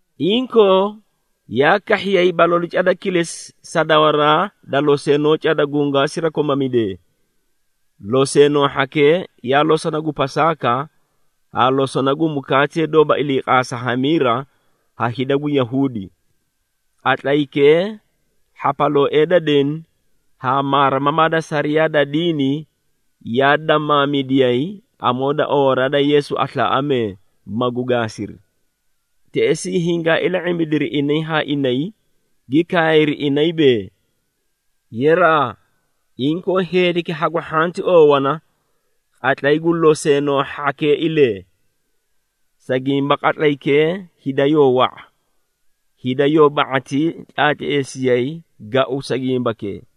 Inkoo yaa kahhiyay balalu cada kilesi sa dawaraa da loseenoo cada gungwaa sirakomamidee. Loseenoo hhakee yaa losona gu Pasaaka haa losona gu mukaatee doóba iliiqaasa hamiira ha hida gu Yahuudi. Qatlaykee hhapalooee da deni haa maarimamaa da sariyaa da diini yaa damaamidiyay amoo da oowaraa da Yeesu aslaaꞌamee, magu gaasiri. Teꞌesii hingaa ila⁄imbidiri inay haa inay, gi kaayri, inay bee, “Yeraa, inkoo heediki hagu hhanti oowana qatlay gu loseenoo hhakeeilee, sa gimba qatlaykee hida yoo wa⁄a, hida yoo ba⁄atii tlaatleesiyay gau sa gimbakee.”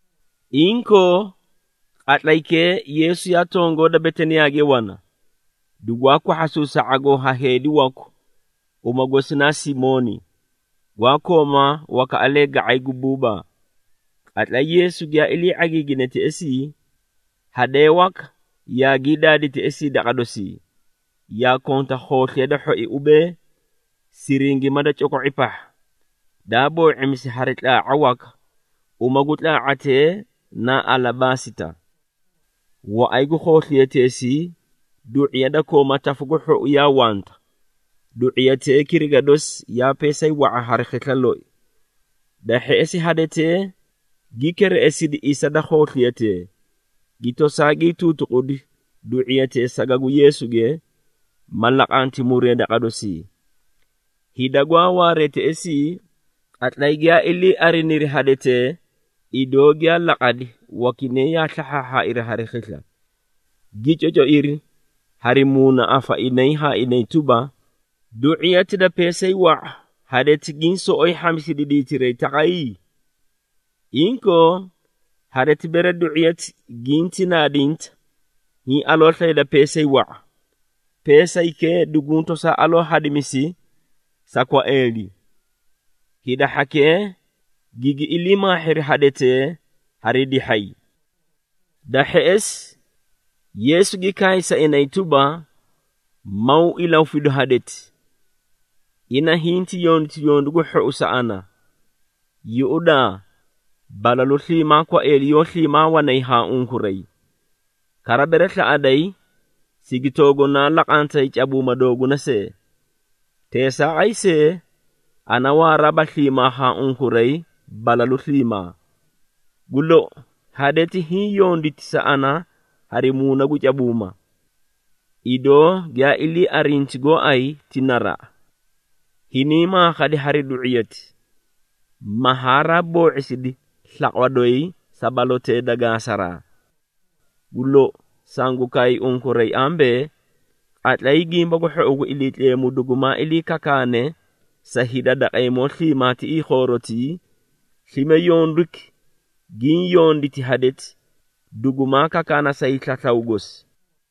Inkoo, qatlaykee Yeesu yaa tongoo da Betaniyaage wana, dugwaa kwahhasuusi sa ⁄agoo ha heedi waku, uma gosi na Simooni, gwaa kooma wakaꞌalee ga⁄ay gu buubaa. Qatlay Yeesu giyaa ilii ⁄agiigine teꞌesii, hadee waka yaagii daadi teꞌesii daqa dosii, yaa konta khoosliya da hhoi ubee, siringima da coko⁄i pahha, daa boo⁄imisi hari tlaa⁄a waka, uma gu tlaa⁄atee na alabaasita. Waꞌay gu khoosliyateesii du⁄iya da kooma tafu gu hhou yaa wanta, du⁄iyatee kiriga dosi yaa peesay wa⁄a hari khisla loi. Da hheꞌesi hadetee gi kereꞌesidi isa da khoosliyatee, gi tosaa gii tuutuqudi du⁄iyatee saga gu Yeesuge, ma laqanti muree daqa dosii. Hida gwaa waaree teꞌesii, qatlay giyaa ilii ariniri hadetee idoo giyaa laqadi, wakinay yaa slahhaairi hari khisla, gi cocoiri hari muunaꞌafa inay haa inay tuba, “Du⁄iyati da peesay wa⁄a, hadeti giĩ soꞌoyi hhamisidi diitiray taqay? Inkoo hadeti, bere du⁄iyati ginti naadinta, hiĩ aloo slayda peesay wa⁄a, peesaykee duguũ tosaa aloo hadimisi sa kwaeeli.” Hida hhakee gigi ilii maahhiri hadetee hari dihhay. Da hheꞌesi Yeesu gi kaay sa inay tuba, “Maw ilahufidu hadeti! Ina hinti yonditi yondu gu hhou sa ana. Yuꞌudaa, balalu sliimaa kwaeeli yoó sliimaa wanay haa unkuray, kara bere slaꞌaday, sigi toogunaa laqantay cabuuma dooguna see. Teesaaqay see, ana waaraaba sliimaa haa unkuray balalu sliimaa. Gu lou, hadeti hiĩ yonditi sa ana hari muuna gu cabuuma. Idoo giyaa ilii arinti gooay ti naraꞌa. Hiniĩ maakhadi hari du⁄iyati, ma haraa boo⁄isidi slaqwa doyi sa balotee da qaasaraa. Gu lou, sangu kaay unkuray ambee, qatlay Gimba gu Hhou gu Iliitleemu dugumaa ilii kakaane sa hida daqeemoo sliimaa tiꞌii khoorotii, slime yonduki giĩ yonditi hadeti, dugumaa kakaana sa hiislaslaw gosi.”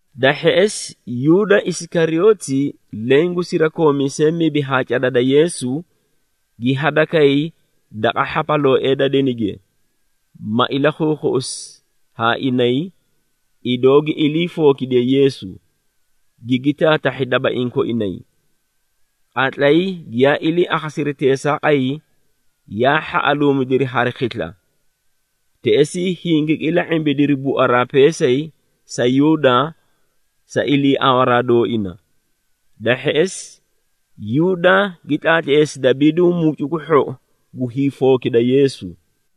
Da hheꞌesi Yuuda Isikariyooti, leẽ gu sirakoomiisee mibi haa cada da Yeesu, gi hadakay daqa hhapalooee da denige, ma ilakhuukhuꞌusi haa inay, idoo gi ilii fookidiye Yeesu, gigi taatahhi dabaiĩ koinay. Qatlay giyaa ilii akhasiri teesaaqay, yaa hhaꞌaluumidiri hari khisla, teꞌesii hingigi ila⁄imbidiri buaraa peesay sa Yuuda sa iliiawaraa dooina. Da hheꞌesi Yuuda gi tlaatleesi dabiidu mucu gu hhou gu hiifookida Yeesu.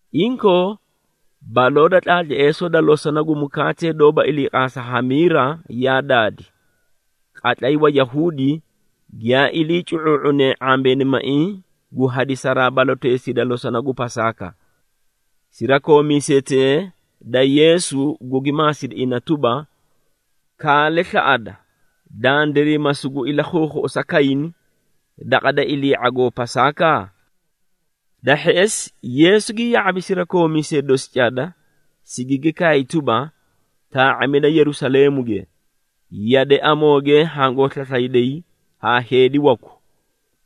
Inkoo, baloo da tlaatleesoo da losona gu mukaatee doóba iliiqaasa hamiira yaa daadi, qatlay Wayahuudi giyaa ilii cu⁄uu⁄unee ⁄ambeenimaiĩ gu hadisaraa baloteesii da losona gu Pasaaka. Sirakoomiisetee da Yeesu gugi maasidi ina tuba, “Kaale slaꞌada, dandiray ma sugu ilakhuukhuꞌusa kayni daqa da ilii ⁄agoo Pasaaka?” Da hheꞌesi Yeesu gi ya⁄abi sirakoomiisee dosi cada, sigigi kaay tuba, “Taa⁄amida Yerusaleemuge, yade amooge hangoo slaslayday haa heedi waku,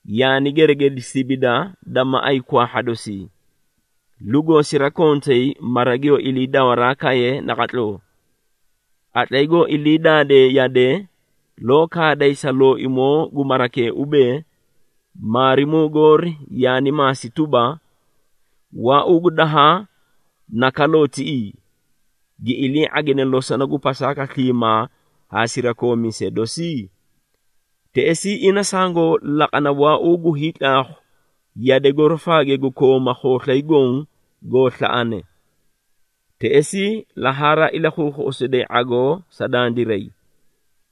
yaani geregedi sibida da maꞌay kwaahha dosii, lugoo sirakontay mara giyoo ilii dawaraa kaye naqatloo. Qatlay goo ilii daadee yade, loo kaaday sa looimoo gu marakee ubee, ‘Maarimuu goori yaani maasi tuba, “Waauu gu dahaa na kaloo tiꞌii, gi ilii ⁄agine losona gu Pasaaka sliimaa haa sirakoomiisee dosi?” ’ Teꞌesii ina sangoo laqana waauu gu hiitlaakhu yade gorofaage gu kooma khooslay goõ goo slaꞌane. Teꞌesii la haraa ilakhuukhuꞌusiday ⁄agoo sa dandiray.”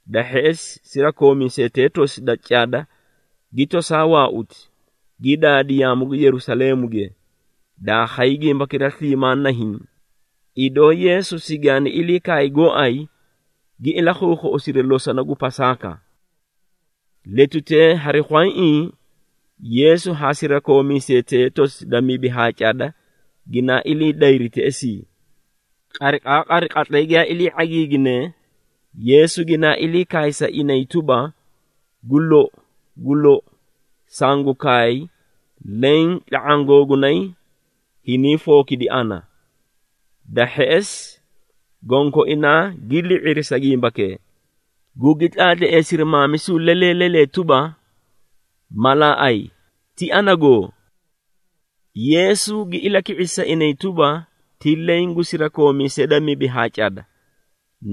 Da hheꞌesi sirakoomiisetee tosi da cada gi toosaa waauti, gi daadi yaamu gu Yerusaleemuge, daa khay gimbakira sliimaa nahiĩ, idoo Yeesu sigaani ilii kaay gooay gi ilakhuukhuꞌusiri losona gu Pasaaka. Letutee hari khwayaiĩ Yeesu haa sirakoomiisetee tosi da mibi haa cada ginaa ilii dayri teꞌesii. Qariqaaqari qatlay giyaa ilii ⁄agiiginee, Yeesu ginaa ilii kaay sa inay tuba, “Gu lou, gu lou, sangu kaay leẽ tla⁄aã googunay, hiniĩ fookidi ana.” Da hheꞌesi gonkoinaa gi li⁄iri sa gimbakee, gugi tlaatleesiri maamisu lelee lelee tuba, “Malaaꞌay, ti anagoo?” Yeesu gi ilaki⁄isi sa inay tuba, “Ti leẽ gu sirakoomiisee da mibi haa cada,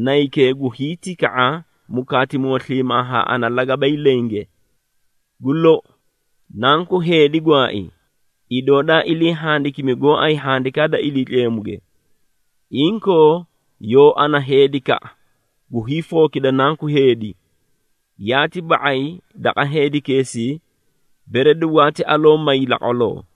naykee gu hiitika⁄a mukaatimoo sliimaa haa ana lagabay lenge. Gu lou, Nanku Heedi gwaai, idoo daa ilii handikimi gooay Handikaa da Iliitleemuge. Inkoo, yoo ana heedikaꞌa gu hiifookida Nanku Heedi! Yaati ba⁄ay daqa heedikeesii, bere dugwaati aloo may laqwaloo.”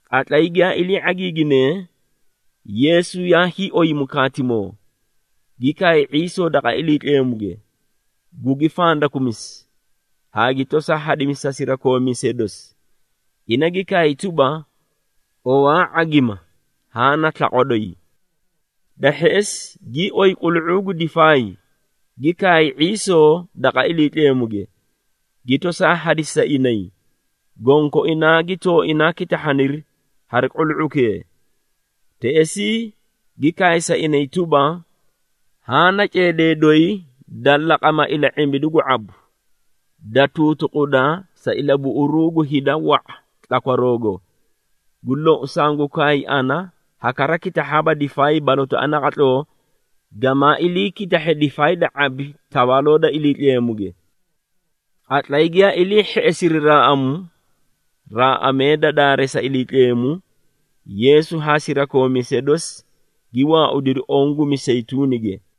Qatlay giyaa ilii ⁄agiiginee, Yeesu yaa hiioy mukaatimoo, gi kaay ⁄iisoo daqa Iliitleemuge, gugi fandakumisi, haa gi tosaa hadisi sa sirakoomiisee dosi. Ina gi kaay tuba, “Owaa ⁄agima, haã na slaqwa doyi.” Da hheꞌesi gii oyi qulu⁄uu gu difaay, gi kaay ⁄iisoo daqa Iliitleemuge, gi tosaa hadisi sa inay, gonkoinaa gi tooinaa kitahhaniri hari qulu⁄ukee. Teꞌesii gi kaay sa inay tuba, “Haã na ceedee doyi da laqama ila⁄imbidu gu ⁄abu, da tuutuquda sa ilabuꞌuruu gu hida wa⁄a tlakwaroogo. Gu lou, sangu kaay ana ha kara kitahhaaba difaay balotaꞌa naqatloo gamaa iliikitahhe difaay da ⁄abi Tawaaloo da Iliitleemuge.” Qatlay giyaa ilii hheꞌesiri raaꞌamu, raaꞌamee da daareesa Iliitleemu, Yeesu haa sirakoomiisee dosi gi waaudiri oõ gu Miseyituunige.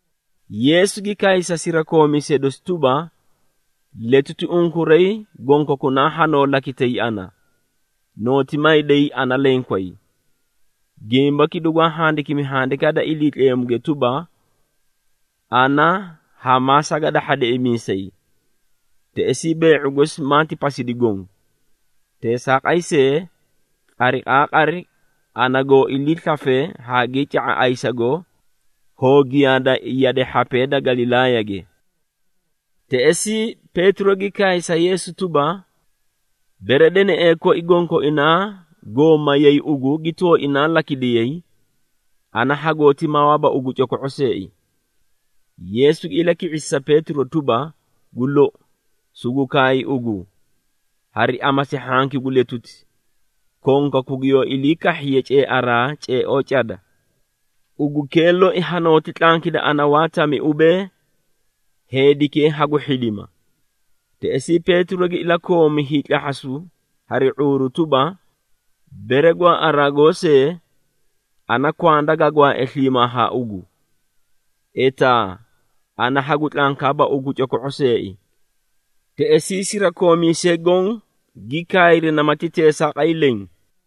Yeesu gi kaay sa sirakoomiisee dosi tuba, “Letuti unkuray gonkokunaa hanoo lakitay ana, nooti mayday ana lenkway. Gimbaki dugwaa handikimi Handikaa da Iliitleemuge tuba, ‘Ana hamaa sagadahha deꞌemiisay, teꞌesii bee⁄u gosi maati pasidi goõ.’ Teesaaqay see, qariqaaqari ana goo iliislafe haagii ca⁄a ayisago, hoo giyaada yade hhapee da Galilaayage.” Teꞌesii Peetiro gi kaay sa Yeesu tuba, “Bere deneꞌee koi gonkoinaa goo mayay ugu gi tooinaa lakidiyay, ana hagooti mawaaba ugu coko⁄o seei!” Yeesu gi ilaki⁄isi sa Peetiro tuba, “Gu lou, sugu kaay ugu, hari amasi hhanki gu letuti, konkaku giyoo ilii kahhiye ceearaa ceeoo cada, ugukee loi hanooti tlankida ana waa tami ubee, ‘Heedikee hagu hhidima!’” Teꞌesii Peetiro gi ilakoomi hiitlahhasu hari ⁄uuru tuba, “Bere gwaaꞌaraa goosee, ana kwanda ga gwaae sliimaa haa ugu, etaa ana hagu tlankaaba ugu coko⁄o seei.” Teꞌesii sirakoomiisee goõ gi kaayri namati teesaaqay leẽ.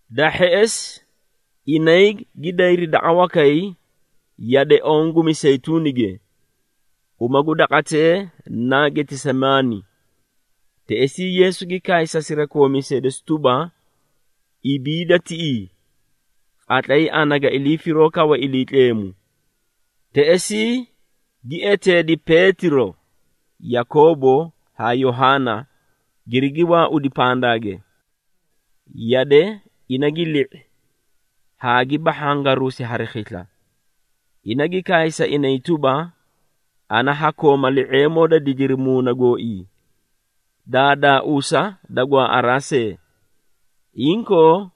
Da hheꞌesi, inay gi dayri daqa wakay yade oõ gu Miseyituunige, uma gu daqatee naa Getesemaani. Teꞌesii Yeesu gi kaay sa sirakoomiisee dosi tuba, “Ibiida tiꞌii, qatlay ana ga ilii firoo kawe Iliitleemu.” Teꞌesii gi eteedi Peetiro, Yakoobo haa Yohaana, girigi waaudi pandaage. Yade ina gi li⁄i haa gi bahhangaruusi hari khisla. Ina gi kaay sa inay tuba, “Ana ha kooma li⁄eemoo da didiri muuna gooii, daadaauusa da gwaaꞌaraa see. Inkoo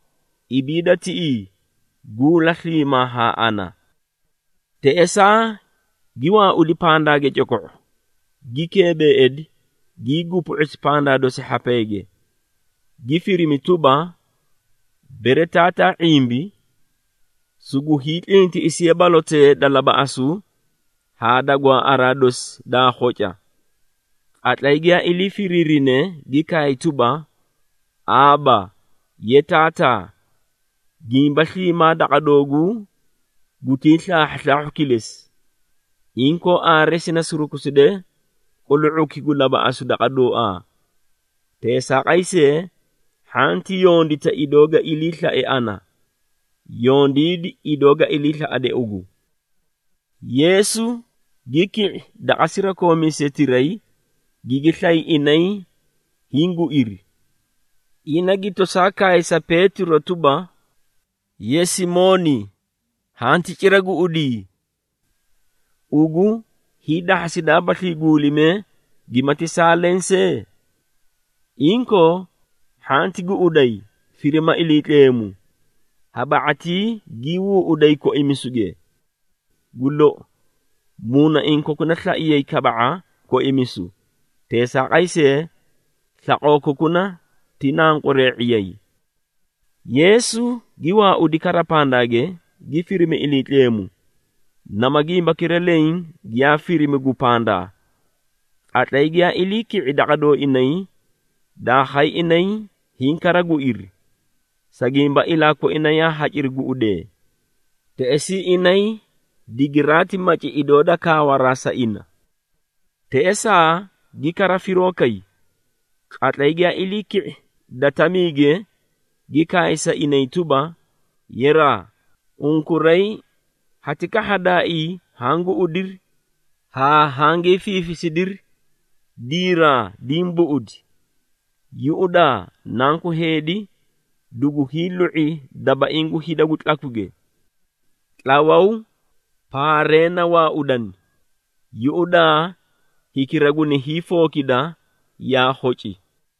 ibiida tiꞌii, guula sliimaa haa ana.” Teꞌesaa gi waaudi pandaage coko⁄o, gi keebeeidi, gii gupu⁄usi pandaa dosi hhapeege, gi firimi tuba, bere Taataa ⁄imbi, sugu hiitlintiꞌisiye balotee da labaꞌasu haa da gwaaꞌaraa dosi daa khoca. Qatlay giyaa ilii firiirine, gi kaay tuba, “Aaba, ye Taataa, gimba sliimaa daqa dooguu gutii slaahhuslaahhu kilesi. Inkoo aare sini surukuside qulu⁄uki gu labaꞌasu daqa dooaa. Teesaaqay see, hhanti yondita idoo ga iliislae ana, yondiidi idoo ga iliislaꞌade ugu.” Yeesu gi ki⁄i daqa sirakoomiisetiray, gigi slay inay hiĩ guiri. Ina gi tosaa kaay sa Peetiro tuba, “Ye Simooni hanti cira guꞌudii? Ugu hiidahhasidaabaslii guulimee gimati saa leẽ see? Inkoo, hhanti guꞌuday, firima Iliitleemu, ha ba⁄atii gii huuꞌuday koimisuge. Gu lou, muunaiĩ kokuna slaiyay kaba⁄a koimisu, teesaaqay see, slaqoo kokuna ti nanqweree⁄iyay.” Yeesu gi waaudi kara pandaage, gi firimi Iliitleemu nama gimbakira leẽ giyaa firimi gu pandaa. Qatlay giyaa ilii ki⁄i daqa dooinay, daa khay inay hiĩ kara guiri, sa gimba ilaa koina yaa haciri guꞌudee. Teꞌesii inay digiraati maci idoo da kaawaraa sa ina. Teꞌesaa gi kara firoo kay. Qatlay giyaa ilii ki⁄i da tamiige, gi kaay sa inay tuba, “Yeraa, Unkuray hati kahhadaaii haã guꞌudiri, haa hangii fiifisidiri? Diraa, diĩ buꞌudi! Yuꞌudaa, Nanku Heedi dugu hiilu⁄i dabaiĩ gu hida gu tlakwige. Tlawaw, paaree na waaudani! Yuꞌudaa, hikira guni hiifookida, yaa khoci!”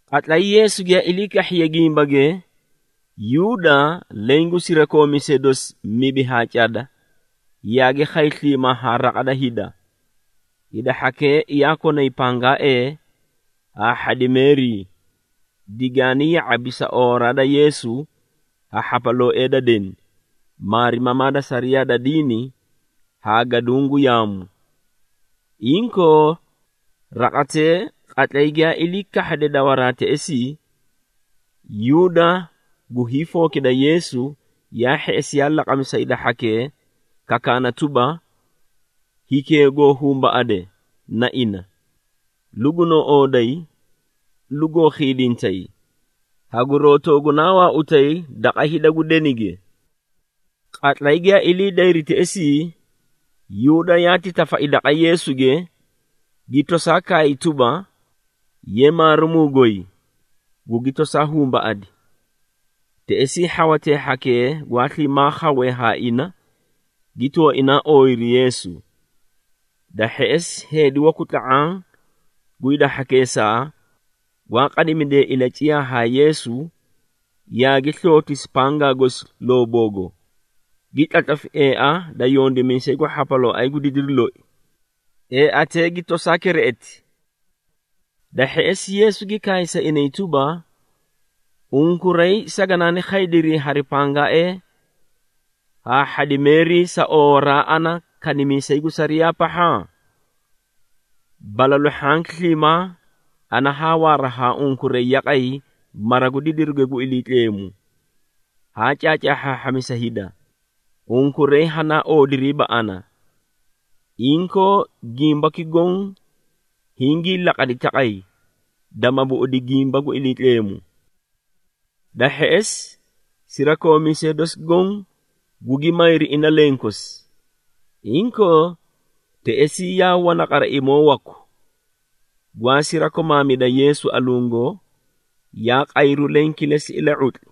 Qatlay Yeesu giyaa ilii kahhiye gimbage, Yuuda, leẽ gu sirakoomiisee dosi mibi haa cada, yaagi khay sliimaa haa raqa da hida. Hida hhakee yaa konay pangaaee haa hhadimeerii, digaani ya⁄abi sa oowaraa da Yeesu ha hhapalooee da deni, maarimamaa da sariyaa da diini haa gaduũ gu yaamu. Inkoo raqatee, qatlay giyaa ilii kahhade dawaraa teꞌesii, Yuuda gu hiifookida Yeesu yaa hheꞌesi yaa laqami sa hida hhakee kakaana tuba, “Hikee goo humbaꞌade, na ina, lugunoo ooday, lugoo khiidintay, haguroo toogunaa waautay daqa hida gu denige.” Qatlay giyaa ilii dayri teꞌesii, Yuuda yaati tafai daqa Yeesuge, gi tosaa kaay tuba, “Ye Maarimuu goy,” gugi tosaa humbaꞌadi. Teꞌesii hhawatee hhakee gwaa sliimaa khawee haa ina, gi tooinaa ooyiri Yeesu. Da hheꞌesi heedi waku tla⁄aã gu hida hhakeesaa, gwaa qadimidee ilaciyaa haa Yeesu, yaagi slootisi pangaa gosi looboogo, gi tlatlafi eea da yondimiisay gu hhapalooay gu didiru loi, eeatee gi tosaa kereꞌeti. Da hheꞌesi, Yeesu gi kaay sa inay tuba, “Unkuray saganaani khaydiri hari pangaaee haa hhadimeerii sa oowaraa ana kanimiisay gu sariyaa pahha? Balalu hhanki sliimaa ana haa waara haa unkuray yaqay mara gu didiruge gu Iliitleemu, haa caacaahhaahhamisa hida, unkuray hanaa oodiriiba ana. Inkoo, gimbaki goõ hingii laqadi taqay, dama buꞌudi gimba gu Iliitleemu.” Da hheꞌesi, sirakoomiisee dosi goõ gugi mayri ina lenkosi. Inkoo teꞌesii yaa wana qaraimoo waku, gwaa sirakomaamida Yeesu alungo, yaa qayru leẽ kilesi ila⁄utli.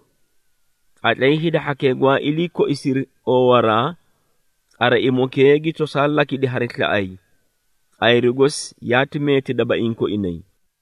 Qatlay hida hhakee gwaa ilii koisiri oowaraa, qaraimokee gi tosaa lakidi hari slaꞌay, qayru gosi yaati meeti dabaiĩ koinay.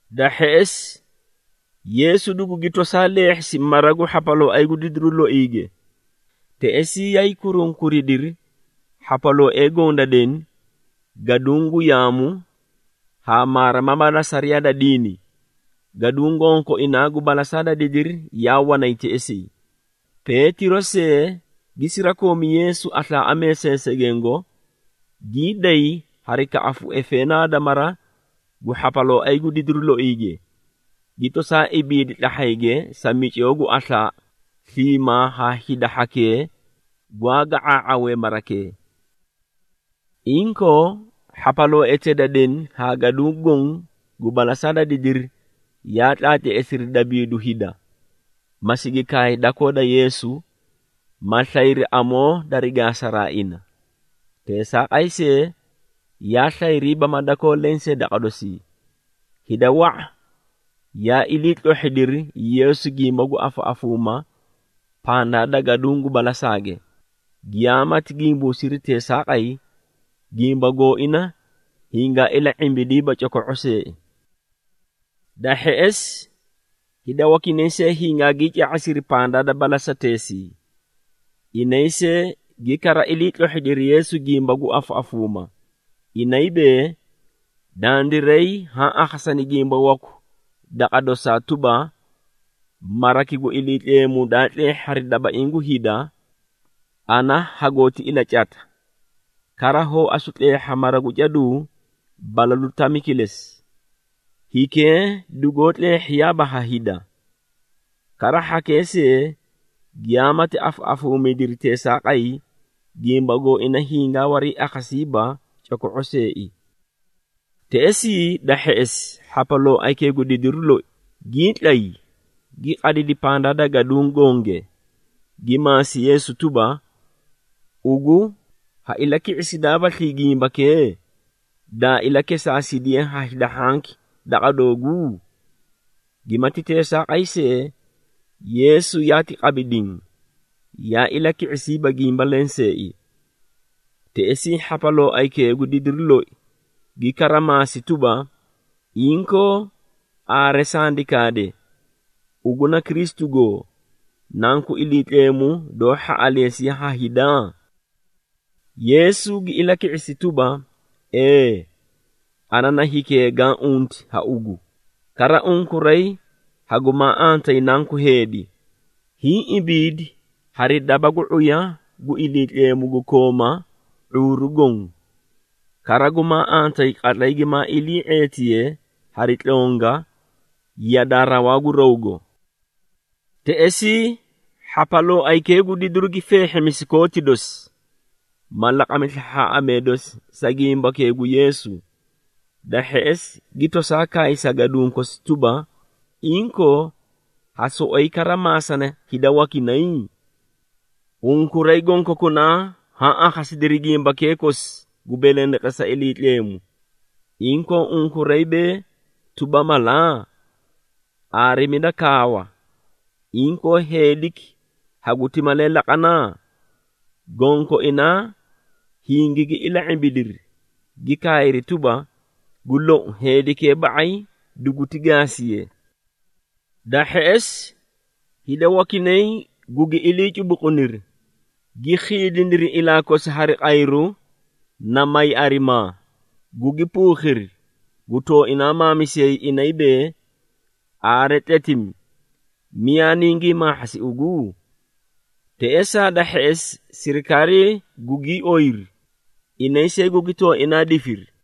Da hheꞌesi Yeesu dugugi tosaa leehhisi mara gu hhapalooay gu didiru loige, teꞌesii yaay kurunkuridiri hhapalooee goõ da deni, gaduũ gu yaamu haa maarimamaa da sariyaa da diini, gaduũ gonkoinaa gu balasaa da didiri yaa wanay teꞌesii. Peetiro see gi sirakoomi Yeesu aslaaꞌamee seesegengo, gii day hari kaꞌafu efeenaa da mara gu hhapalooay gu didiru loige, gi tosaa ibiidi tlahhayge sa micoo gu aslaa sliimaa haa hida hhakee gwaa ga⁄aa⁄awee marakee. Inkoo hhapalooetee da deni haa gaduũ goõ gu balasaa da didiri yaa tlaatleesiri dabiidu hida, ma sigi kaay dakoo da Yeesu, ma slayri amoo dari gaasaraa ina. Teesaaqay see, yaa slayriiba ma dakoo lensee daqa dosii. Hida wa⁄a yaa iliitlohhidiri Yeesu gimba gu afaꞌafuumaa pandaa da gaduũ gu balasaage, giyaamati gimbuusiri teesaaqay, gimba gooina hingaa ila⁄imbidiiba coko⁄o seei. Da hheꞌesi hida wakinay see hingaagii ca⁄asiri pandaa da balasateesii. Inay see gi kara iliitlohhidiri Yeesu gimba gu afaꞌafuuma, inay bee, “Dandiray haa akhasani gimba waku daqa dosaa tuba, ‘Maraki gu Iliitleemu daa tleehhi hari dabaiĩ gu hida, ana hagooti ilacata, kara hoo asu tleehha mara gu caduu balalu tami kilesi, hikee dugoo tleehhiyaaba ha hida.’” Kara hhakee see giyaamati afaꞌafuumidiri teesaaqay, gimba gooina hingaa wariiakhasiiba coko⁄o seei. Teꞌesii da hheꞌesi hhapalooaykee gu didiru loi gii tlay, gi qadidi pandaa da gaduũ gonge, gi maasi Yeesu tuba, “Ugu ha ilaki⁄isidaabaslii gimbakee, daa ilakesaasidiye ha hida hhanki daqa dooguu?” Gimati teesaaqay see, Yeesu yaati qabi diĩ, yaa ilaki⁄isiiba gimba lenseei. Teꞌesii hhapalooaykee gu didiru loi gi kara maasi tuba, “Inkoo aare sandi kaade, ugu na Kristu goo, Nanku Iliitleemu doó hhaꞌaleesiye ha hida?” Yeesu gi ilaki⁄isi tuba, “Ee! Ana na hikee gaã unti ha ugu, kara unkuray hagumaa antayi Nanku Heedi, hiĩ ibiidi hari daba gu ⁄uya gu Iliitleemu gu kooma ⁄uuru goõ. Kara gumaa antayi qatlay gimaa ilii ⁄eetiye hari tlonga yadaa rawaa gu rawgo.” Teꞌesii hhapalooaykee gu didiru gi feehhimisi kooti dosi, ma laqami slahhaaꞌamee dosi sa gimbakee gu Yeesu, da hheꞌesi gi tosaa kaay sa gaduũ kosi tuba, “Inkoo ha soꞌoyi kara maasana hida wakinay? Unkuray gonkokunaa haã akhasidiri gimbakee kosi gu belendeqesa Iliitleemu, inkoo unkuray bee tuba mala? Aarimida kaawa, inkoo heediki haguti malee laqana?” Gonkoinaa hingigi ila⁄imbidiri, gi kaayri tuba, “Gu lou, heedikee ba⁄ay duguti gaasiye!” Da hheꞌesi hida wakinay gugi ilii cubuquniri, gi khiidiniri ilaa kosi hari qayru na may arimaa, gugi puukhiri, gu tooinaa maamisiyay, inay bee, “Aare tletimi, miyaa ningii maahhasi ugu?” Teꞌesaa da hheꞌesi sirikaarii gugii oyiri, inay see gugi tooinaa difiri.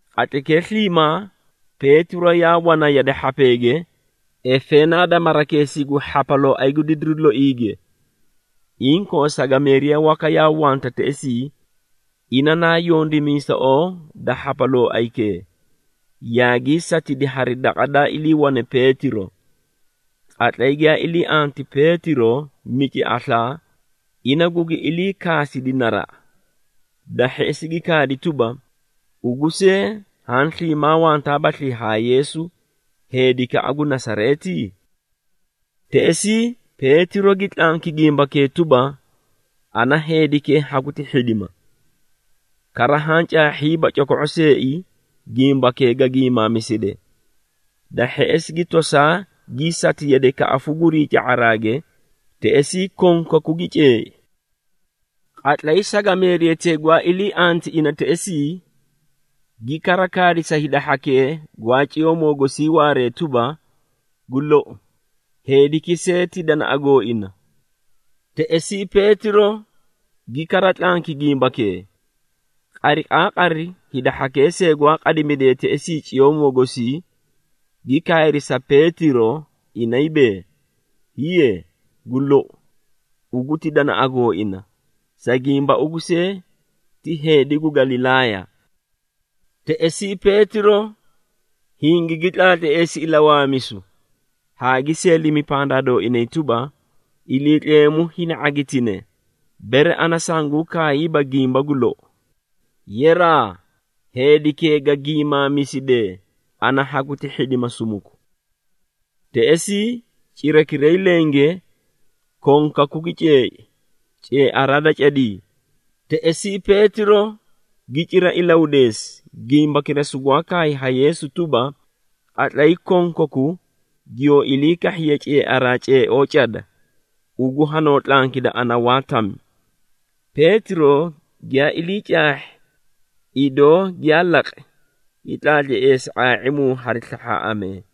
Qatlaykee sliimaa Peetiro yaa wana yade hhapeege, efeenaa da marakeesii gu hhapalooay gu didiru loige. Inkoo sagameeriya waka yaa wanta teꞌesii, ina naa yondimiisoꞌoo da hhapalooaykee, yaagii catidi hari daqa daa iliiwane Peetiro. Qatlay giyaa ilii anti Peetiro mici aslaa, ina gugi iliikaasidi naraꞌa. Da hheꞌesi gi kaadi tuba, “Ugu see haã sliimaa wantaabaslii haa Yeesu, heedikaꞌa gu Nasareeti?” Teꞌesii Peetiro gi tlanki gimbakee tuba, “Ana heedikee haguti hhidima, kara haã caahhiiba coko⁄o seei gimbakee ga giimaamiside.” Da hheꞌesi gi tosaa gii sati yade kaꞌafu gurii ca⁄araage, teꞌesii konkaku gi ceei. Qatlay sagameeriyatee gwaa ilii anti ina teꞌesii, gi kara kaadi sa hida hhakee gwaa ciyoomoo gosii waaree tuba, “Gu lou, heediki see ti danaꞌa gooina!” Teꞌesii Peetiro gi kara tlanki gimbakee. Qariqaaqari hida hhakee see gwaa qadimidee teꞌesii coomoo gosii, gi kaayri sa Peetiro, inay bee, “Hiiye, gu lou, ugu ti danaꞌa gooina, sa gimba ugu see ti heedi gu Galilaaya.” Teꞌesii Peetiro hingigi tlaatleesi ilawaamisu, haa gi seelimi pandaa dooinay tuba, “Iliitleemu hini ⁄agitine, bere ana sanguũ kaayiiba gimba gu lou! Yeraa, heedikee ga giimaamisidee, ana haguti hhidima sumuku!” Teꞌesii cirakiray lenge konkaku gi ceei ceearaa da cadii. Teꞌesii Peetiro gi cira ilahudeesi, gimbakira sugwaa kaay ha Yeesu tuba, “Qatlay konkaku giyoo ilii kahhiye ceearaa ceeoo cada, ugu hanoo tlankida ana waa tami.” Peetiro giyaa ilii caahhi, idoo giyaa laqi, gi tlaatleesi ⁄aa⁄imu hari slahhaaꞌamee.